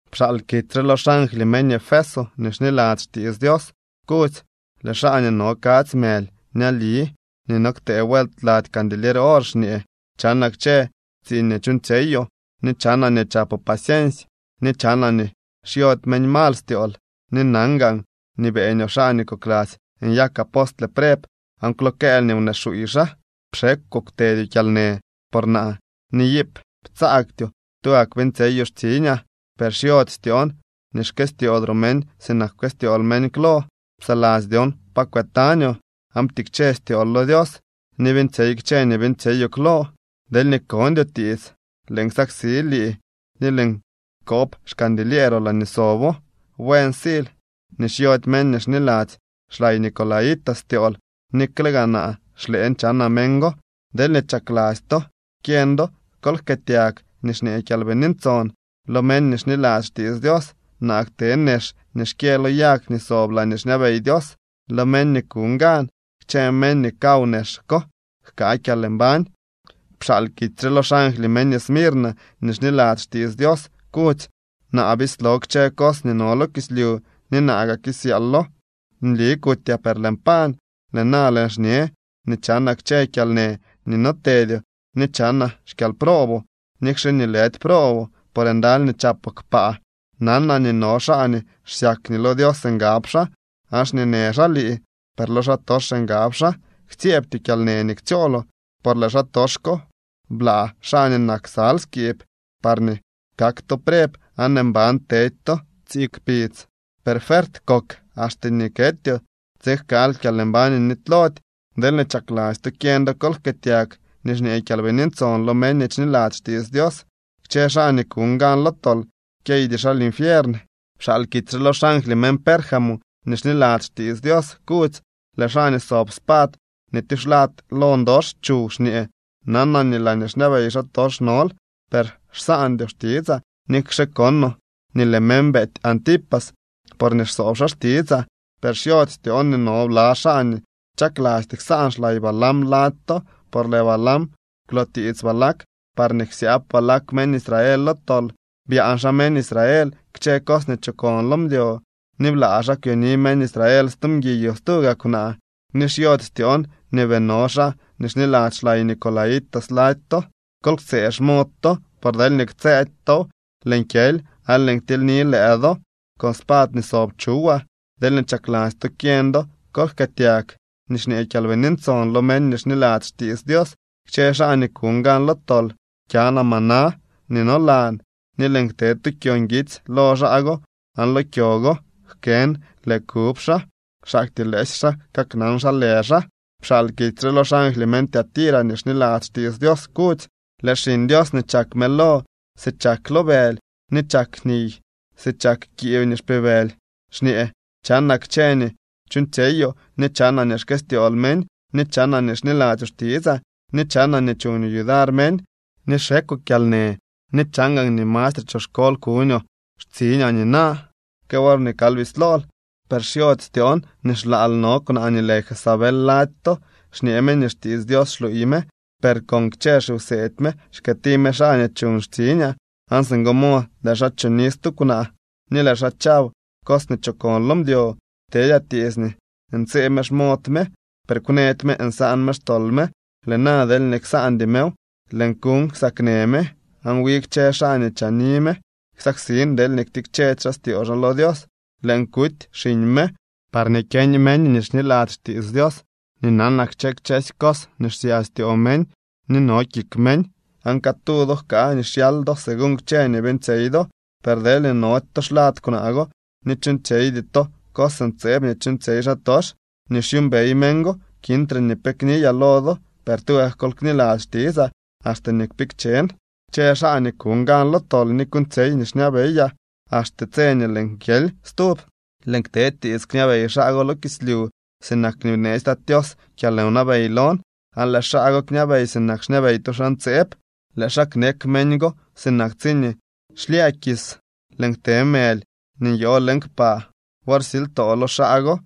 ’Pxaal kitsy re lo xangly meñ Efeso nii xniladzy xtiits Dios, kudzy: “Lëë xaa nii no kadzy mëly ñali ni no ktee vuelt lady candilier or xñee: Chanaa kchë tsiiñ nii chuuñtsyeyoo, ni chanaa nii chapoo paciensy, ni chanaa nii xyody meñ mal styool, ni nan gaan nii beeñoo xaa nii kokladzy nyak apostle preb aan kwlookëël nii wnee xuuy xaa. Pxekwoo kwtedyoo kyalnë por naa ni iip ptsaagtyoo tugak beeñtsyeyoo xtsiñaa. Per xyody styoon nii xkëstyoodroo meñ sinak pkëstyool meñ klo. Psaladzy dyon pa kwëtañoo, aan ptikche styool lo Dios ni beeñtsyey kchë nii beeñtsyeyoo klo. Deelñee kondyoo tiits, lëën ksaksi lii ni lëën kob xcandilieeroo laañee sobo. Buen siil nii xyody meñ nii xniladzy xlay Nicolaítas styool nikle gaa naa xlëën chanaa meñ go. Deelñee chakladzy to kyeñ do, kol jkëëtyag nii xñee Kyalbini Ntson lo meñ nii xniladzy xtiits Dios. Naa kte nex nii xkyë lo yag nii sob laañee xñabey Dios lo meñ nii kuñ gan. Kchë meñ nii kaw nex ko jkaa kyalmbañ.” ’Pxaal kitsy re lo xangly meñ Esmirna nii xniladzy xtiits Dios, kudzy: “Naa bislo kchë cos nii no lo kislyu ni naa gaa kisyaalo. Nli kutyaa, per lëën pañ. Lëë na lëën xñe nii chanaa kchë kyalnë nii no tedyoo ni chanaa xkyalprooboo, nikxe nii lëdy prooboo, por ndaly nii chapoo kpaa. Nanaa nii no xaa nii xsyak nii lo Dios ngab xaa, aan xñeenë xaa lii, per lo xaatox ngab xaa. Ktsyeebtyoo kyalnë nii ktsyooloo, por lëë xaatox ko bla xaa nii nak ksal skiib, parñee kak to preb aan mban tedy to tsii kpidz. Per fuert kok axte nii ketyoo, tsiin jkaal kyalmbañ nii nitylody. Deelñee chakladzy to kyeñ do, kol jkëëtyag nii xñee Kyalbini Ntson lo meñ nii xniladzy xtiits Dios. Kchë xaa nii kuñ gan lo tol kyeydy xaa linfiern.” ’Pxaal kitsy re lo xangly meñ Pérgamo nii xniladzy xtiits Dios, kudzy: “Lëë xaa nii sob spad nii tyuxlad lo ndox chuw xñee: Nanaa nii laañee xñabey xaatox nol, per xsaandyoo xtitsaa nikxe konoo nii lëë meñ beety Antipas porñee xsoob xaa xtitsaa. Per xyody styoon nii no bla xaa nii chaklasty ksaan xlay Balaam lady to, por lëë Balaam kwlootiits Balac parñee ksyaab Balac meñ Israel lo tol. Byaan xaa meñ Israel kchë cos nii chokon lo mdyo ni blaa xaa kwyoni meñ Israel stu mguiy o stuu gaa kwnaa. Ni xyody styoon nii bii no xaa nii xniladzy xlay Nicolaítas lady to. Kol ktsëë xmod to, por deelñee ktsëëdy tow, lëën kyely aan lëën ktilyni lëë do con spad nii sob chuwaa. Deelñee chakladzy to kyeñ do, kol jkëëtyag nii xñee Kyalbini Ntson lo meñ nii xniladzy xtiits Dios. Kchë xaa nii kuñ gan lo tol kyanaa maná nii nolan, ni lëën kte tu kyo nguitsy lo xaa go aan lo kyo go jkën lë kub xaa, xaktyee lëësy xaa kaknan xa lë xaa.” ’Pxaal kitsy re lo xangly meñ Tiatira nii xniladzy xtiits Dios, kudzy: “Lëë Xiñ Dios nii chak mëlo si chak lo bëly ni chak niy si chak kiib nii xpibëly xñee: Chanaa kchë nii chuuñtsyeyoo, ni chanaa nii xkëstyool meñ, ni chanaa nii xniladzyoo xtitsaa, ni chanaa nii chuñoo yudar meñ ni xekwoo kyalnë ni chan gaan nii mastre choxkol kuñoo xtsiñaa nina que worñee kal bislool. Per xyody styoon nii xlaal no kwnaa nii lë Jezabel lady to. Xñee me nii xtiits Dios xluuy me, per con kchë xiwseedy me xkëëti me xaa nii chuñ xtsiñaa aan singo mod lëë xaa choni stu kwnaa ni lëë xaa chaw cos nii chokon lo mdyo. Ptedyaa tiits nii ntsëë me xmod me, per kwnëdy me nsaan me xtol me. Lëë na deelñee ksaandy mew, lëën kuuñ ksaknë me, aan wi kchë xaa nii chaani me ksaksin deelñee ktikchedy xaa styoo xaa lo Dios. Lëën kuty xiñ me, parñee kyeñ meñ nii xniladzy xtiits Dios nii nanaa kchë kchësy cos nii xsya styoo meñ ni no kik meñ, aan catu do jkaa nii xyal do según kchë nii beeñtsyey do. Per deelñee nody to xlad kwnaa go ni chuuñtsyeydy to cos ntseeb nii chuuñtsyey xaatox nii xyuumbey meñ go, kintre ni pe kniyaa lo do. Per tugak kol kniladzy xtitsaa axte nii kpikchen. Kchë xaa nii kuñ gan lo tol ni kuuñtsyey nii xñabeyaa axte tse nii lëën kyely stub, lëën kte tiits kñabey xaa go lo kislyu sinak nii bneetsy Tat Tios kyalwnabey lon. Aan lëë xaa go kñabey sinak xñabey tu xaa ntseeb. Lëë xaa knek meñ go sinak tsiñee xlyë kis. Lëën kte mëly nii nyoo leñ kpaa wor silytoo lo xaa go.